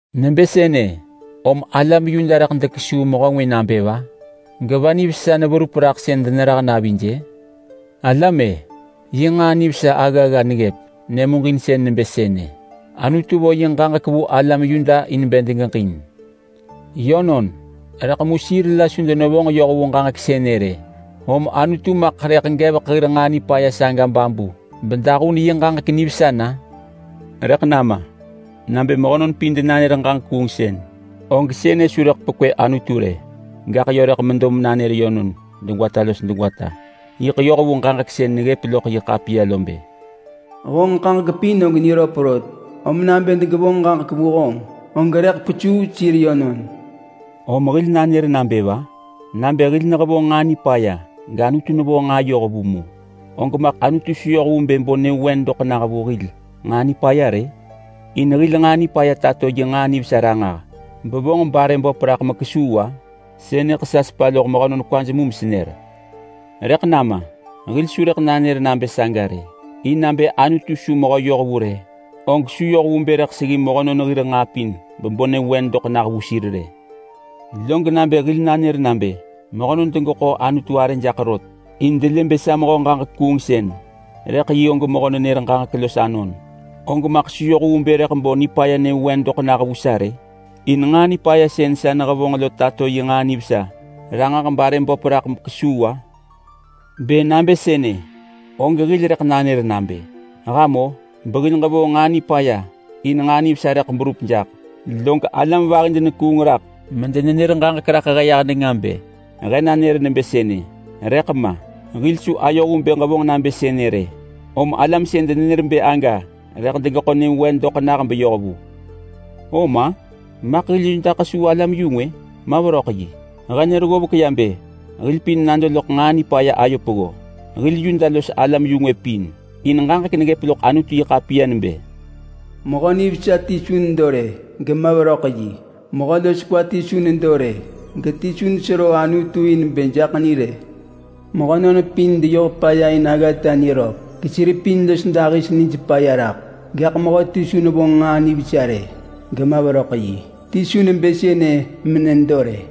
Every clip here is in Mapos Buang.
Nebë sënë, om alam Yuda rëḳ dekesuu mehö ngwë nabë va? Geva nivesa neverup raḳ sën denerah navij-ë? Alam-e! Yi nġaa nivesa aggagga neggëp! Nyëmuġinsën nebë sënë: Anutu vo yi ġaġek vu alam Yuda in bë degeġin. Yönon, rëḳ mu sir la su denevonġ yoh vu ġaġek sënë rë. Om Anutu maḳ rëḳ gevek hir nġaa nipaya saga babu bedahun yi ġaġek nivesa na? Rëḳ nama! Nabë mehönon pin denanër ġaġek kuungsën, og sënë su rëḳ pekwë Anutu rë, gaḳ yö rëḳ medo menanër yönon degwata los degwata. Yiḳ yoh vu ġaġek sën neggëp loḳ yi ḳapiya lo bë: “Honġ ġaġek pin og niröp rot. Om nabë degevonġ ġaġek vu honġ, og rëḳ kwesuu sir yönon.” Om hil rëḳ nanër nabë va? Nabë hil nehevonġ nġaa nipaya gAnutu nevonġ nġaa yohvu mu, og maḳ Anutu su yoh vu bë bo nyëvewen doḳ nah hil nġaa nipaya rë? In hil nġaa nipaya tato yi nġaa nivesa ranġah bevonġ barë böp raḳ mekesuu-a?—sënëḳ sa nesepa loḳ mehönon kwaj mu mesenër— rëḳ nama! Hil su rëḳ nanër nabë saga rë, in nabë Anutu su mehö yohvu rë, og su yoh vu bë rëḳ seggi mehönon hir nġaa pin bebo nyëvewen doḳ nah vu sir rë. Log nabë hil nanër nabë mehönon degeḳo Anutu arë jaḳ rot, in delë bë sa mehö ġaġek kuungsën, rëḳ yi og mehö nenër ġaġek los anon, og maḳ su yoh vu bë rëḳ bo nipaya nyëvewen doḳ nah vu sa rë? In nġaa nipaya sën sa nehevonġ lo tato yi nġaa nivesa ranġah barë böp raḳ mekesuu-a? Bë nabë sënë, og hil rëḳ nanër nabë, “Ham-o! Behil ġevonġ nġaa nipaya in nġaa nivesa rëḳ berup jaḳ!” Log alam vahi denekuung raḳ medenenër ġaġek raḳ he yah nenga bë he nanër nebë sënë! Rëḳ ma! Hil su ayoh vu bë ġevonġ nabë sënë rë! Om alam sën denenër bë aga rëḳ degeḳo nyëvewen doḳ nah beyoh vu. Om-a? Maḳ hil Yuda kesuu alam-yu-ngwë? Ma veröḳ yi! He nër ggovek ya bë hil pin nado loḳ nġaa nipaya ayo peggo. Hil Yuda los alam-yu-ngwë pin. In ġaġek neggëp loḳ Anutu-yi-ḳapiya nebë: “Mehö nivesa ti su nedo rë, gema veröḳ yi. Mehö los kwa ti su nedo rë, geti su nesero Anutu in bë jaḳ ni rë. Mehönon pin deyoh paya in aggata niröp, gesir pin los dahis nij paya raḳ. Gaḳ mehöti su nevonġ nġaa nivesa rë, gema veröḳ yi. Ti su nebë sënë menedo rë.”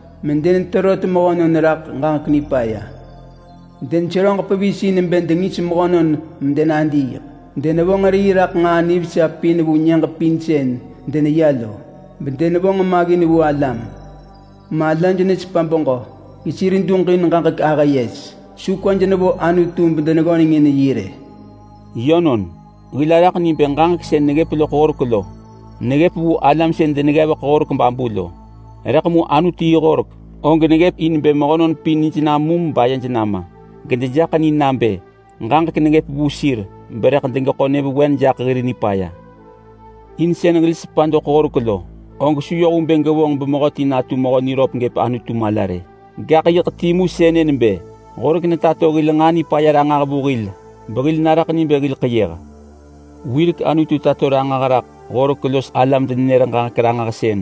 “medeneterot mehönon raḳ ġaġek nipaya”. “Deneseröġ pevis in bë dengis mehönon medenadiiḳ. Denevonġ rii raḳ nġaa nivesa pin vu nyëġ pin sën deneya lo, bedenevonġ maggin vu alam. Malaj nesepa beġö gesir duġin ġaġek-ahë-yes.” “Su kwaj nevo Anutu bedeneggöneng in yi rë.” Yönon, hil araḳ ni bë ġaġek sën neggëp loḳ horek lo neggëp vu alam sën deneggevek horek babu lo. Rëḳ mu Anutu yi horek og neggëp in bë mehönon pin nij namum bayej nama, gedejaḳ ni nabë ġaġek neggëp vu sir berëḳ degeḳo nyëvewen jaḳ hir nipaya. In sën hil sepa doḳ horek lo, og su yoh vu bë gevonġ bemehöti natu mehö niröp gëp Anutu mala rë. Gaḳ yiḳ timu sënë nebë horek netato hil nġaa nipaya ranġah vu hil behil naraḳ ni bë hil ḳeyëh. Wirek Anutu tato ranġah raḳ horek los alam-denenër-ġaġek-ranġahsën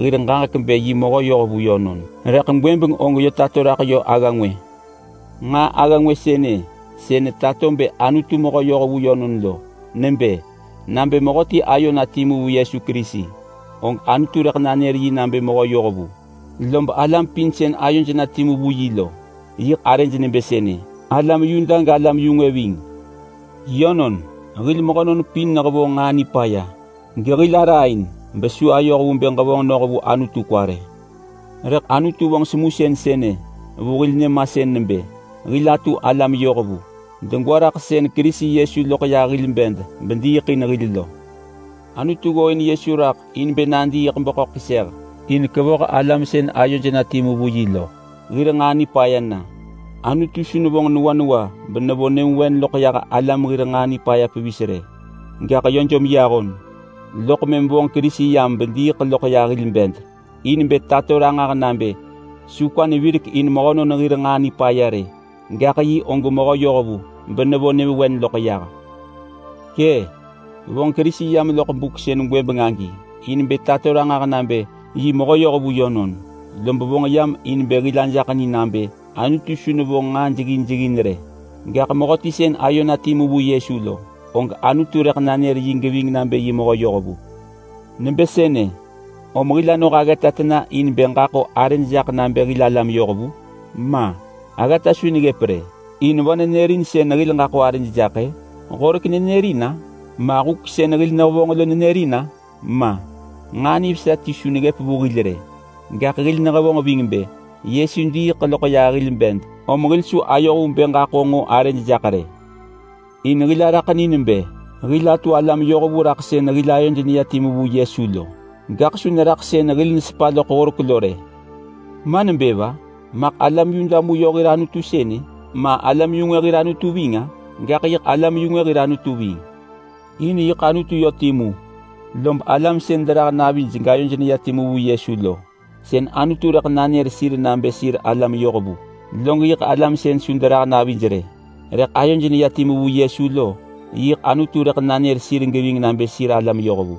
hir ġaġek bë yi mehö yohvu yönon, rëḳ gwëbeng og yö tato raḳ agga ngwë. Nġaa agga ngwë sënë sën netato bë Anutu mehö yohvu yönon lo nebë: Nabë mehöti ayo na timu vu Yesu Kerisi, og Anutu rëḳ nanër yi nabë mehö yohvu. Lob alam pin sën ayoj na timu vu yi lo yiḳ arëj nebë sënë. Alam Yuda galam-yu-ngwë ving. Yönon! Hil mehönon pin nehevonġ nġaa nipaya, gehil araain besu ayoh vu bë ġevonġ noh vu Anutu kwa rë. Rëḳ Anutu vonġ semusën sënë vu hil nyëmasën nebë hil atu alam yohvu, degwa raḳ sën Kerisi Yesu loḳ yah hil bed bediiḳ in hil lo. Anutu ggooin Yesu raḳ in bë nadiiḳ beḳöḳ keseh in kevoh alam sën ayoj na timu vu yi lo hir nġaa nipaya na. Anutu su nevonġ newa newa benevo nyëvewen loḳ yah alam hir nġaa nipaya pevis rë, gaḳ yö jom yi ahon. Loḳ mëm vonġ Kerisi yam bediiḳ loḳ yah hil bed in bë tato ranġah nabë su kwa nevirek in mehönon hir nġaa nipaya rë, gaḳ yi og mehö yohvu benevo nyëvewen loḳ yah. Kë, vonġ Kerisi yam loḳ buk sën gwëbeng agi in bë tato ranġah nabë yi mehö yohvu yönon. Lob vonġ yam in bë hil ajaḳ ni nabë Anutu su nevonġ nġaa jeggin jeggin rë. Gaḳ mehöti sën ayo na timu vu Yesu lo, og Anutu rëḳ nanër yi geving nabë yi mehö yohvu. Nebë sënë, om hil anoh aggata tena in bë ġaḳo arëd jaḳ nabë hil alam yohvu? Ma! Aggata su neggëp rë! In va nenërin sën hil ġaḳo arëd jak-ë? Horek nenërin-a? Ma huk sën hil nehevonġ lo nenërin-a? Ma! Nġaa nivesa ti su neggëp vu hil rë, gaḳ hil nehevonġ ving bë Yesu diiḳ loḳ yah hil bed, om hil su ayoh vu bë ġaḳo nġo arëd jaḳ rë. In hil araḳ ni nebë hil atu alam yohvu raḳ sën hil ayod neya timu vu Yesu lo, gaḳ su neraḳ sën hil nesepa loḳ horek lo rë. Ma nebë va? Maḳ alam Yuda mu yö hir Anutu sënë ma, alam-yu-ngwë hir Anutu ving-a? Gaḳ yiḳ alam-yu-ngwë hir Anutu ving! In yiḳ Anutu yö timu. Lob alam sën derah navij gayoj neya timu vu Yesu lo, sën Anutu rëḳ nanër sir nabë sir alam yohvu. Log yiḳ alam sën su derah navij rë, rëḳ ayoj neya timu vu Yesu lo, yiḳ Anutu rëḳ nanër sir geving nabë sir alam yohvu.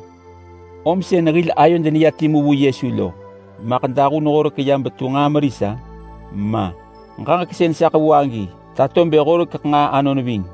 Om sën hil ayod neya timu vu Yesu lo maḳ dahun horek ya betu nġaa meris-a? Ma! Ġaġek sën sa ḳevu agi tato bë horekeḳ nġaa anon ving.